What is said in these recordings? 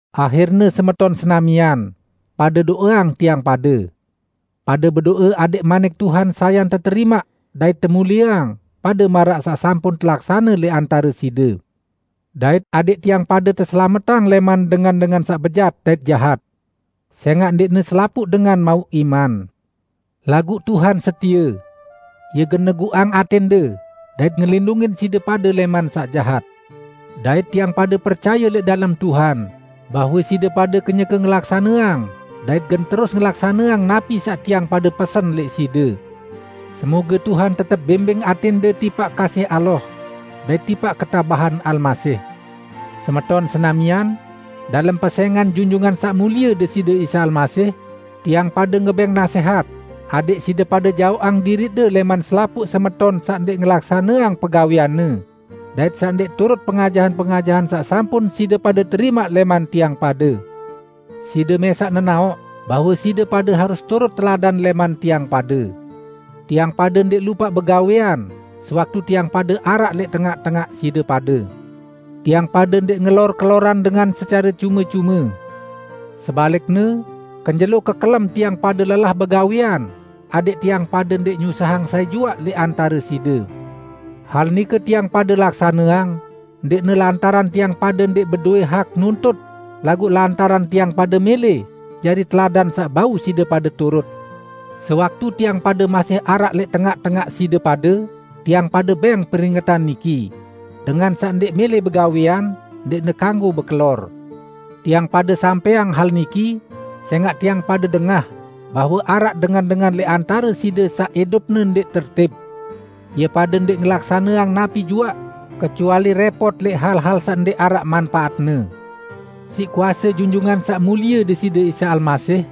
Ahirne semeton senamian, pade do'eang tiang pade. Pade bedo'e adẽq manik Tuhan sayan teterimaq dait temulieang, pade maraq saq sampun telaksane lẽq antare side. Dait adẽq tiang pade teselametang lẽman dengan-dengan saq bejat dait jahat. Sẽngaq ndẽqne selapuq dengan mauq iman. Laguq Tuhan setie. Ie gen neguqang atẽnde dait ngelindungin side pade lẽman saq jahat. Dait tiang pade percaye lẽq dalem Tuhan, bahwe side pade kenyeke ngelaksaneang dait gen terus ngelaksaneang napi saq tiang pade pesen lẽq side. Semoge Tuhan tetep bimbing atẽnde tipaq kasih Allah, dait tipaq ketabahan Almasih. Semeton senamian, dalem pesẽngan Junjungan Saq Mulie Deside Isa Almasih, tiang pade ngebẽng nasẽhat adẽq side pade jaoqang diriqde lẽman selapuq semeton saq ndẽq ngelaksaneang pegawẽanne, dait saq ndẽq turut pengajahan-pengajahan saq sampun side pade terimaq lẽman tiang pade. Side mẽsaq nenaoq bahwe side pade harus turut teladan lẽman tiang pade. Tiang pade ndẽq lupaq begawẽan sewaktu tiang pade araq lẽq tengaq-tengaq side pade. Tiang pade ndẽq ngelor keloran dengan secare cume-cume. Sebalikne kenjelo kekelem tiang pade lelah begawẽan adẽq tiang pade ndẽq nyusahang sai juaq lẽq antare side. Hal nike tiang pade laksaneang ndẽqne lantaran tiang pade ndẽq bedowẽ hak nuntut, laguq lantaran tiang pade mẽlẽ jari teladan saq bau side pade turut. Sewaktu tiang pade masih araq lẽq tengaq-tengaq side pade, tiang pade bẽng peringetan niki, "Dengan saq ndẽq mẽlẽ begawẽan, ndẽqne kanggo bekelor." Tiang pade sampẽang hal niki sẽngaq tiang pade dengah bahwe araq dengan-dengan lẽq antare side saq idupne ndẽq tertib. Ie pade ndẽq ngelaksaneang napi juaq, kecuali rẽpot lẽq hal-hal saq ndẽq araq manpaatne. Siq kuase Junjungan Saq Mulie Deside Isa Almasih,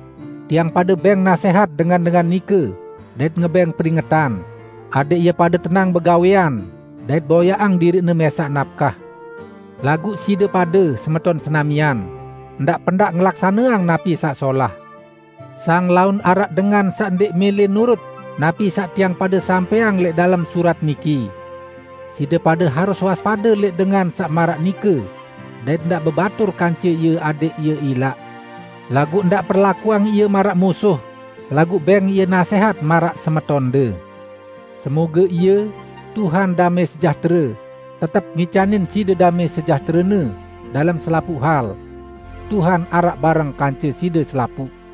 tiang pade bẽng nasẽhat dengan-dengan nike dait ngebẽng peringetan, adẽq ie pade tenang begawẽan dait boyaqang diriqne mẽsaq napkah. Laguq side pade, semeton senamian, ndaq pendaq ngelaksaneang napi saq solah. Sang laun araq dengan saq ndẽq mẽlẽ nurut napi saq tiang pade sampẽang lẽq dalem surat niki. Side pade harus waspade lẽq dengan saq maraq nike dait ndaq bebatur kance ie adẽq ie ilaq. Laguq ndaq perlakuang ie maraq musuh; laguq bẽng ie nasẽhat maraq semetonde. Semoge Ie, Tuhan damẽ sejahtere, tetep ngicanin side damẽ sejahtere-Ne, dalem selapuq hal. Tuhan araq bareng kance side selapuq.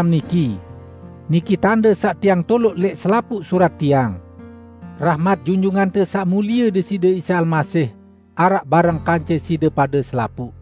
niki. Niki tande saq tiang toloq lẽq selapuq surat tiang. Rahmat Junjungante Saq Mulie Deside Isa Almasih, araq bareng kance side pade selapuq.